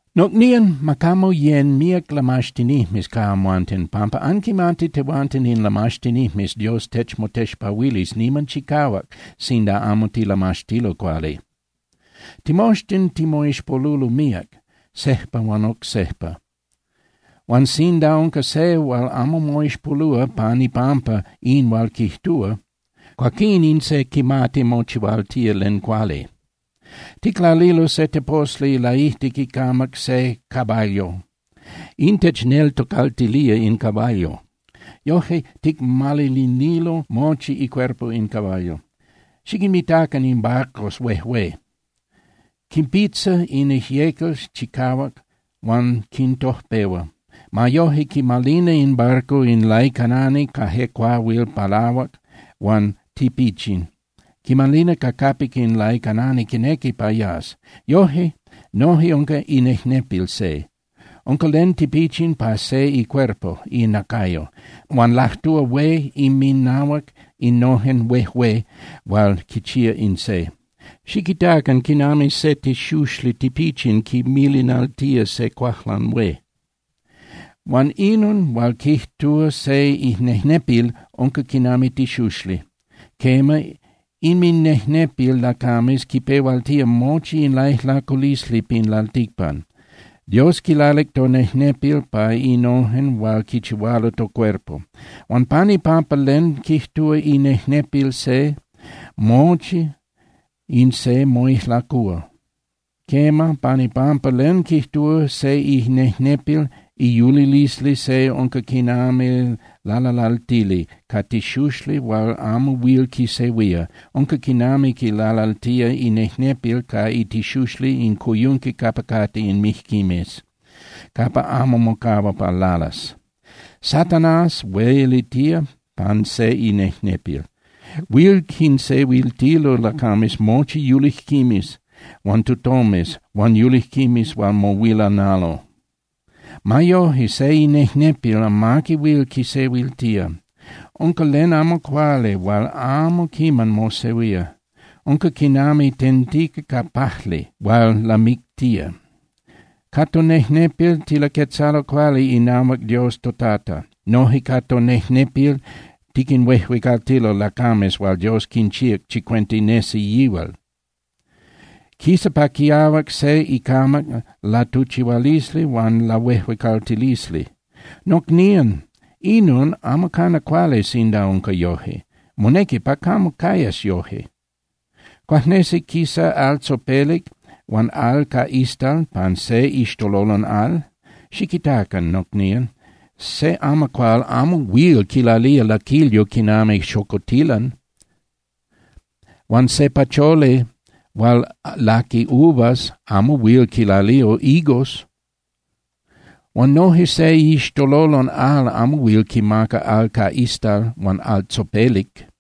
Nocnían, ma camo yén (yecan) míac lamaxtinijmes ca amhuanten, pampa anquimati tehuanten in lamaxtinijmes Dios techmotexpahuilis niman chicahuac sinda amo tilamaxtilo cuali. Timoxtin timoixpolulo míac, sejpa huan oc sejpa. Huan sinda unca se hual amo moixpolúa pan ipampa in hual quijtúa, cuaquín in se quimati mochihualtía len cuali. Ticlalilo se teposli laijtic icamac se caballo. In techneltocaltilía in caballo, yojque ticmalinililo mochi icuerpo in caballo. Xiquinmitacan in barcos huejué. Quinpitza in ijyecal chicahuac huan quintojpehua. Ma yoje quimalina in barco in laicanani ca je cuahuil palahuac huan tipichin, quimalina ca capic in laicanani quinequi pa yas. Yoje noje unca inejnepil se. Unca len tipichin pa se icuerpo (inacayo), huan lajtúa hué inminahuac innojen huejué hual quichía in se. ¡Xiquitacan quinami se tixuxli tipichin quimilinaltía se cuajlan hué! Huan inon hual quijtúa se inejnepil unca quinami tixuxli. Quema, inminejnepil lacames quipehualtía mochi in laijlaculisli pin lalticpan. Dios quilalic tonejnepil pa innojen hual quichihualo tocuerpo. Huan pan ipampa len quijtúa inejnepil se, mochi in se moijlacúa. Quema, pan ipampa len quijtúa se inejnepil, iyulilisli se unca quinami lalalaltili ca tixuxli hual amo huil quisehuía. Unca quinami quilalaltía inejnepil ca itixuxli in coyunqui capa cate in mijquimes, capa amo mocahua pa lalas. Satanás huelitía pan se inejnepil. Huil quinsehuiltilo lacames mochi yulijquimes huan tutomes huan yulijquimes hual mohuilanalo. Ma yoje, se inejnepil amaqui huil quisehuiltía. Unca len amo cuali hual amo quiman mosehuía. Unca quinami tentica ca pajli hual lamictía. Ca tonejnepil tilaquetzalo cuali inahuac Dios toTata. Noje ca tonejnepil tiquinhuejuecaltilo lacames hual Dios quinchíac chicuenta nesi yihual. Quisa pa quiahuac se icamac latuchihualisli huan lahuejuecaltilisli. Nocnían, inon amo cana cuali sinda unca yoje, monequi pa camo cayas yoje. ¿Cuajnesi quisa al tzopelic huan al ca istal pan se iixtololon al? Xiquitacan, nocnían, se amacuál amo huil quilalía laquilyo quinami xocotilan, huan se pacholi hual laqui uvas amo huil quilalía higos. Huan noje se iixtololon al amo huil quimaca al ca istal huan al tzopelic.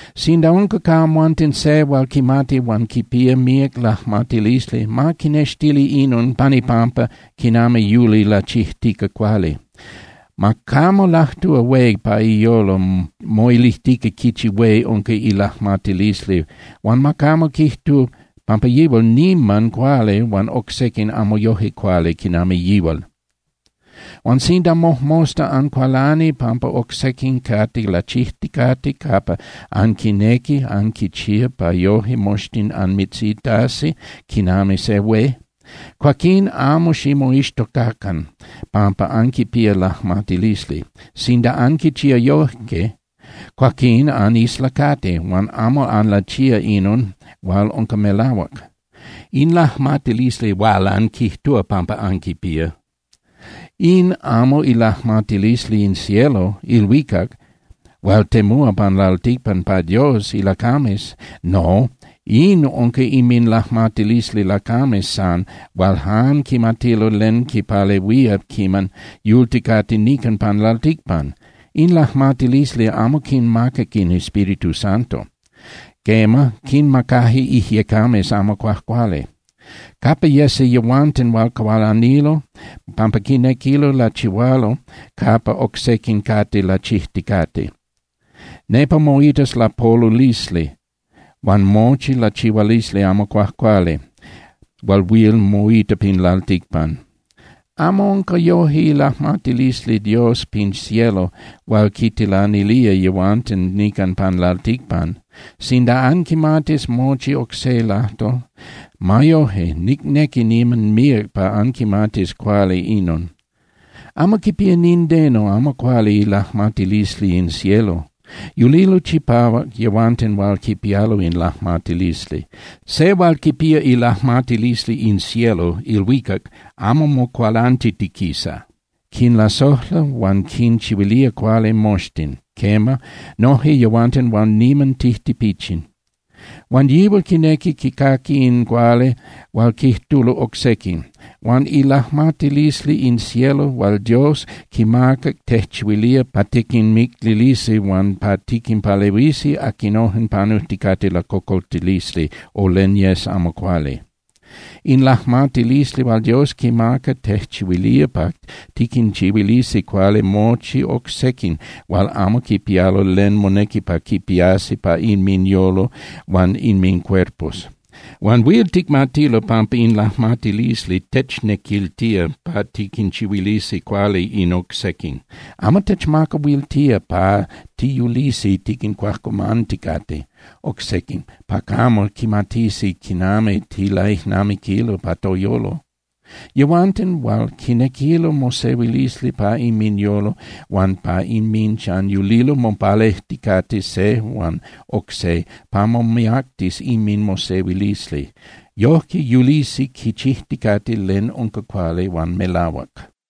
Sinda unca ca amhuanten se hual quimati huan quipía míac lajmatilisli, ma quinextili inon pan ipampa quinami yuli lachijtica cuali. Ma camo lajtúa hué pa iyolo moilijtica quichi hué unca ilajmatilisli huan ma camo quijtu pampa yihual niman cuali huan oc sequin amo yoje cuali quinami yihual. Huan sinda mojmosta ancualani pampa oc sequin cate lachijticate capa anquinequi anquichía pa yoje moxtin anmitzitasi quinami se hué, cuaquín amo ximoixtocacan pampa anquipía lajmatilisli. Sinda anquichía yoje, cuaquín anislacati huan amo anlachía inon hual unca melahuac. In lajmatilisli hual anquijtúa pampa anquipía, in amo ilajmatilisli in cielo (ilhuicac) hual temúa pan lalticpan pa Dios ilacames. No, in unca inminlajmatilisli lacames san hual jan quimatilo len quipalehuía quiman yulticate nican pan lalticpan. In lajmatilisli amo quinmacac in Espíritu Santo. Quema, quinmacaje ijyecames amo cuajcuali. Capa yesi yehuanten hual cualanilo pampa quinequilo lachihualo capa oc sequin cate lachijticate, nepa moitas lapolulisli huan mochi lachihualisli amo cuajcuali hual huil moita pin lalticpan. Amo unca yoje ilajmatilisli Dios pin cielo hual quintilanilía yehuanten nican pan lalticpan. Sinda anquimatis mochi oc se lajtol, ma yoje, nicnequi niman míac pa anquimatis cuali inon: Amo quipía nindeno amo cuali ilajmatilisli in cielo. Yulilo chipahuac yehuanten hual quipialo in lajmatilisli. Se hual quipía ilajmatilisli in cielo (ilhuicac) amo mocualantiquisa, quinlasojla huan quinchihuilía cuali moxtin, quema, noje yehuanten hual niman tijtipichin. Huan yihual quinequi quicaqui in cuali hual quijtulo oc sequin. Huan ilajmatilisli in cielo hual Dios quimaca tejchihuilía pa tiquinmicnilisi huan pa tiquinpalehuisi aquinojen panujticate lacocoltilisli o len yes amo cuali. In lajmatilisli hual Dios quimaca tejchihuilía pa tiquinchihuilisi cuali mochi oc sequin hual amo quipialo len monequi pa quipiasi pa inminyolo huan inmincuerpos. Huan huil ticmatilo pampa in lajmatilisli technequiltía pa tiquinchihuilisi cuali in oc sequin. Amo techmacahuiltía pa tiyulisi tiquincuajcuamanticate oc sequin pa camo quimatisi quinami tilaijnamiquilo pa toyolo. Yehuanten hual quinequilo mosehuilisli pa inminyolo huan pa inminchan yulilo mopalejticate se huan oc se pa momiactis inminmosehuilisli. Yojque yulisi quichijticate len unca cuali huan melahuac.